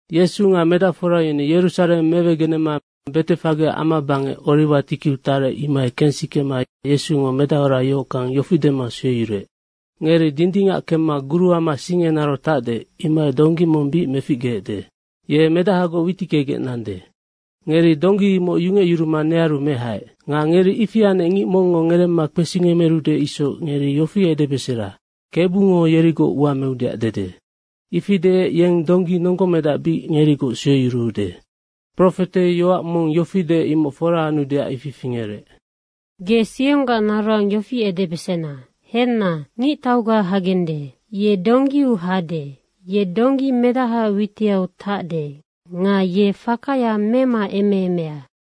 Yesu nga medacfora yeni Yerusareng mewegenema Betefage amabangec Oriwa tikiu tarec, imohai kensikema Yesungo medahora yohockang yofi dema sueyuruec, “Ngeri dindingac kemma guruama sing enarau tacde, imohai donggi mong bic meficgeecde. Ye medahagoc witickegec nande. Ngeri donggi imoc yungecyuruma nearu mehaec. Nga ngeri ifi anec ngic mongngo ngeremma kpesingemerude isoc ngeri yofi edebesera, ‘Kebungo yerigoc ua meudeac dede.’ Ifi deec yeng donggi nonggomedac bic ngerigoc sueyuruude.” Profete yoac mong yofi deec, imoc fora anudeac ifi fingerec. “Ge Sionggac naroang yofi edebesena, ‘Henna, ngictauga hagende. Ye donggiu hade, ye donggi medahaac witiau tacde nga ye fakaya memaemeemea.’”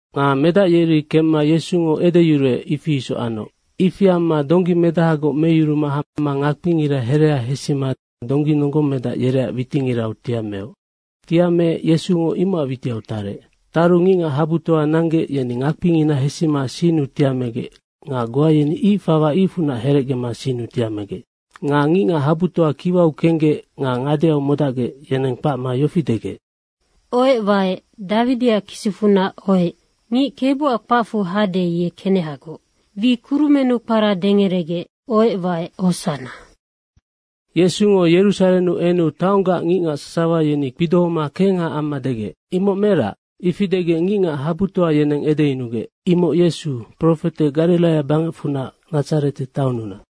Nga medac yeri kemma Yesungo edeyuruec, ifi isoc anoc. Ifi amma donggi medahagoc meyuruma hama ngakpingira herea hesima donggi nonggomedac yereac witingirau tiameoc. Tiameec Yesungo imocac witiau tarec. Taru ngicngac habutoa nanggec, yeni ngakpingina hesima sinnu tiamegec nga goa yeni ic fawa icfunac herecgema sinnu tiamegec. Nga ngicngac habutoa kiwau kenggec nga ngadeau modacgec, yeneng kpacma yofi degec, “Ohec waec, Dawidiac kisicfunac, ohec. Ngic Kebuac kpacfu hade, ye kenehagoc. Wi kurumennu kpara dengeregec, ohec waec, hosanna.” Yesungo Yerusarennu enu taonggac ngicngac sasawa yeni kpidohoma kengha amma degec, “Imoc merac?” Ifi degec ngicngac habutoa yeneng edeyunugec, “Imoc Yesu, profetenoc Gariraia bangecfunac Nadzarete taonnunac.”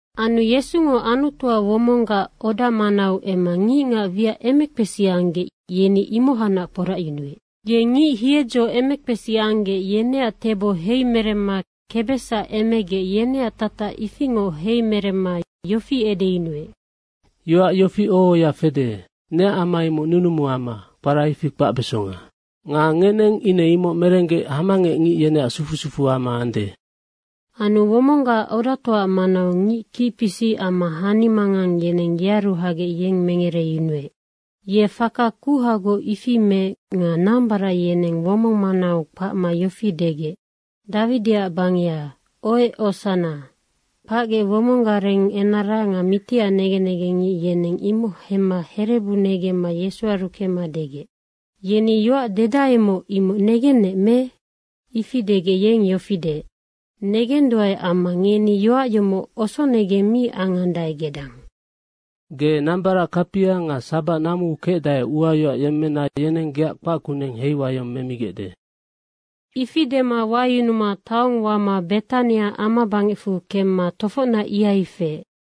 Anu Yesungo Anutuac womonggac oda manau emma ngicngac wiac emekpesi anggec, yeni imohacnac kporacyunuec. Ye ngic hiedzo emekpesi anggec, yeneac tebo heimeremma kebesac emegec, yeneac tatac ifingoc heimeremma yofi edeyunuec, “Yoac yofi oho ohoya fede, ‘Neac ama imoc nunumuama, kpara ifi kpacbesonga.’ Nga ngeneng ine imoc merenggec, hamangec ngic yeneac sufu sufuama ande.” Anu womonggac odatoaac manau ngic kicpisic amma hanimangang yeneng yearu hagec yeng mengereyunuec. Ye faka kuhagoc ifi meec nga nambarac yeneng womong manau kpacma yofi degec, “Dawidiac bangeha, ohec, hosanna.” Kpacgec womong gareng enara nga mitiac negen negengngic yeneng imoc hemma herebu negemma Yesuaru kemma degec, “Yeni yoac dedaemoc, imoc negennec me?” Ifi degec yeng yofi deec, “Negenduae amma ngeni yoac yomocnoc osonegeng mi angandae gedang, ‘Ge nambarac kapia nga sabac namuu kecdae uayoac yemmena yeneng geac kpac kuneng heiwayong memigecde.’” Ifi dema wayunuma taong wama Betania amabangecfu kemma tofocnac ihai kefec.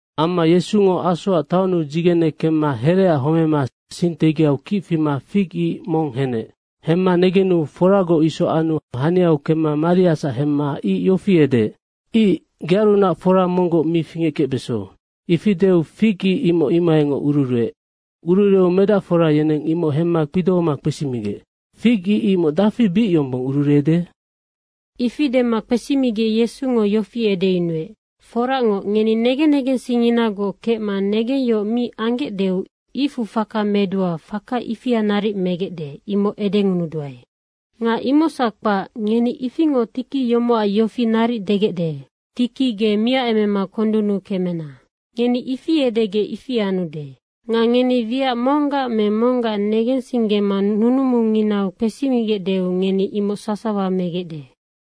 Amma Yesungo asoac taonnu dzigene kemma hereaac homema sing tegiau kic fima fig ic mong henec. Hemma negenu foragoc isoc anu haniau kemma mariasac hemma ic yofi edeec, “Ic, gearunac fora monggoc mi fingeckecbeso.” Ifi deu fig ic imoc imohaingoc ururueec. Ururueu medacfora yeneng imoc hemma kpidohoma kpesimigec, “Fig ic imoc dafi bic yombong ururuede?” Ifi dema kpesimigec Yesungo yofi edeyunuec, “Foracngoc, ngeni negen negensingnginagoc kecma negengyohoc mi anggecdeu icfu faka medua, faka imoc naric megecde, imoc edengunuduae. Nga imocsac kpac, ngeni ifingoc tiki yomocac yofi naric degecde, ‘Tiki ge miacemema kondunnu ukuemema kemena.’ Ngeni ifi edegec, ifinoc anude. Nga ngeni wiac monggac me monggac negensinggema nunumunginau kpesigecdeu ngeni imoc sasawa megecde.”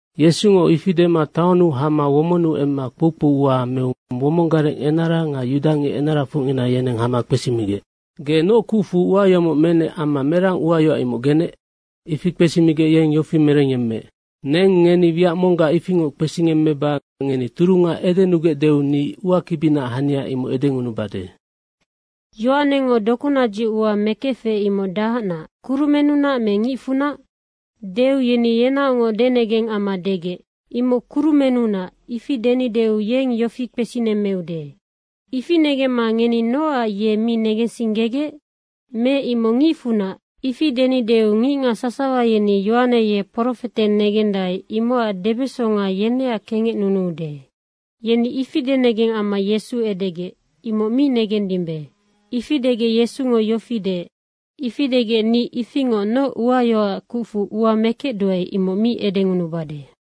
Yesungo ifi dema taonnu hama womonnu emma kpoukpou ua meu womong gareng enara nga yudangic enarafocngina, yeneng hama kpesimigec, “Ge noc kucfu ua yomoc menec amma merang uayoac imoc genec?” Ifi kpesimigec yeng yofi merengyemmeec, “Neng ngeni wiac monggac ifingoc kpesingemmeba ngeni turunga edenugecdeu ni uakibinaac hania imoc edengunubade. Yohanengo dokunadzic ua mekefec, imoc dahacnac, kurumennunac me ngicfunac?” Deu yeni yenaocngoc denegeng amma degec, “‘Imoc kurumennunac.’ ifi denideu yeng yofi kpesinemmeude, ‘Ifi negemma ngeni nocac ye mi negensinggegec?’ Me ‘Imoc ngicfunac.’ ifi denideu ngicngac sasawa yeni Yohaneac ye profete negendae, imocac debesonga yeneac kengecnunude.” Yeni ifi denegeng amma Yesu edegec, “Imoc mi negendimbe.” Ifi degec Yesungo yofi deec, “Ifi degec, ni ifingoc noc uayoacac kucfu ua mekecduae, imoc mi edengunubade.”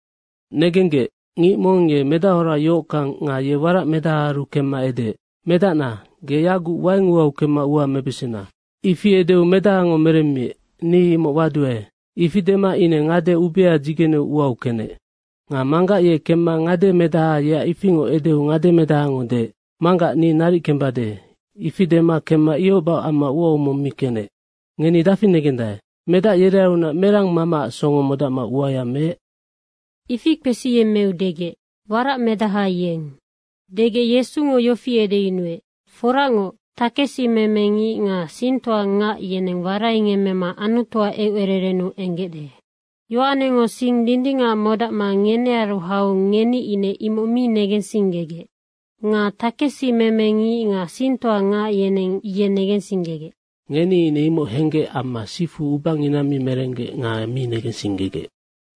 Negenggec, “Ngic mong ye medahora yohockang nga ye waracmedahaaru kemma edeec, ‘Medacna, ge yaguc waing uau kemma ua mebesena.’ Ifi edeu medahango merenec, ‘Ni imoc waduae.’ Ifi dema ine ngade ubea dzigeneu uau kenec. Nga manggac ye kemma ngademedaha, yeac ifingoc edeu ngademedahango deec, ‘Manggac, ni naric kembade.’ Ifi dema kemma ihoc bahoc amma uau mong mi kenec.” Ngeni dafi negendae, “Medac yerearunac merang mamaac songo modacma uaya meec?” Ifi kpesiyemmeu degec, “Waracmedaha yeng.” degec Yesungo yofi edeyunuec, “Foracngoc, takesimeme ngic nga singtoangac yeneng waraingemmema Anutuac eucererennu enggecde. Yohanengo sing dindingac modacma ngenearu hau ngeni ine mi negensinggegec. Nga takesimeme ngic nga singtoangac yeneng ye negensinggegec. Ngeni ine imoc henggec amma sifu ubangina mi merenggec nga mi negensinggegec.”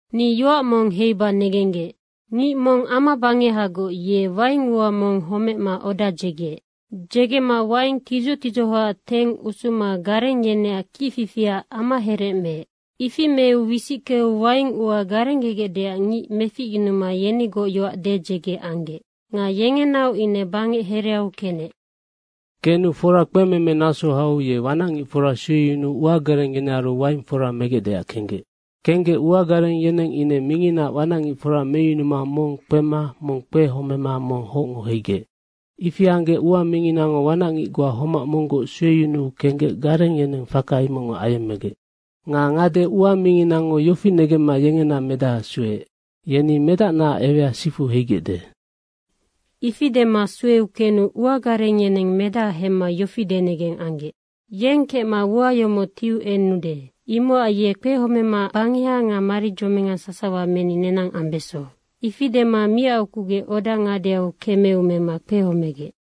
Ni yoac mong heiba negenggec, “Ngic mong amabangehagoc ye waing ua mong homecma oda dzegeec. Dzegema waing tidzoc tidzohoac teng usuma gareng yeneac kicfifiac amaherec meec. Ifi meu wisickeu waing ua garenggegecdeac ngic meficyunuma yenigoc yoac dedzege anggec. Nga yengenaoc ine bangec hereau kenec. Kenu fora kpememe naso hau ye wanacngicfora sueyunuu uagareng yenearu waing fora megecdeac kenggec. Kenggec ua gareng yeneng ine minginaac wanacngicfora meyunuma mong kpema mong kpehomema mong hocngo heigec. Ifi anggec ua minginango wanacngic goa homac monggoc sueyunuu kenggec gareng yeneng faka imocngoc ayemmegec. Nga ngade ua minginango yofi negemma yengena medaha sueec, ‘Yeni medacnaac ewea sifu heigecde.’ Ifi dema sueu kenu ua gareng yeneng medaha hemma yofi denegeng anggec, ‘Yeng kecma ua yomoc tiu enude, imocac ye kpehomema bangeha nga maridzominga sasawa meni nenang ambeso.’ Ifi dema miacukugec oda ngadeau kemeu mema kpehomegec.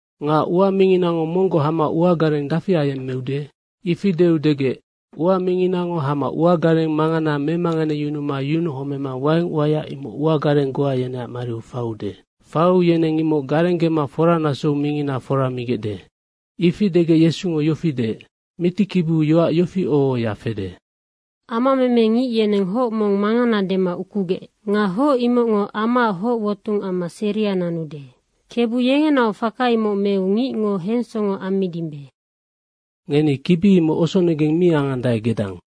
Nga ua minginago monggoc hama uagareng dafi ayemmeude?” Ifi deu degec, “Ua minginango hama uagareng mangana memanganeyunuma yunuhomema waing uaya imoc uagareng goa yeneac mariu faiude. Faiu yeneng imoc garenggema foranasou mingina fora migecde.” Ifi degec Yesungo yofi deec, “Mitikibiu yoac yofi oho ohoya fede, ‘Amameme ngic yeneng hoc mong mangana dema ukugec. Nga hoc imocngo amaac hoc wotung amma seria nanude. Kebu yengenaoc faka imoc meu ngicngo hensongo ammidimbe.’ Ngeni kibi imoc osonegeng mi angandae gedang.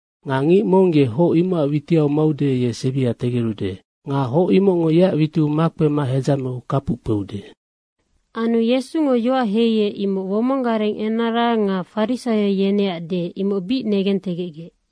Nga ngic mong ye hoc imocac witiau maude, ye sebia tegerude. Nga hoc imocngo yeac witiu makpema hedzameu kapuc kpeude.” Anu Yesungo yoac heiec, imoc womong gareng enara nga farisaio yeneac deec, imoc bic negentegecgec.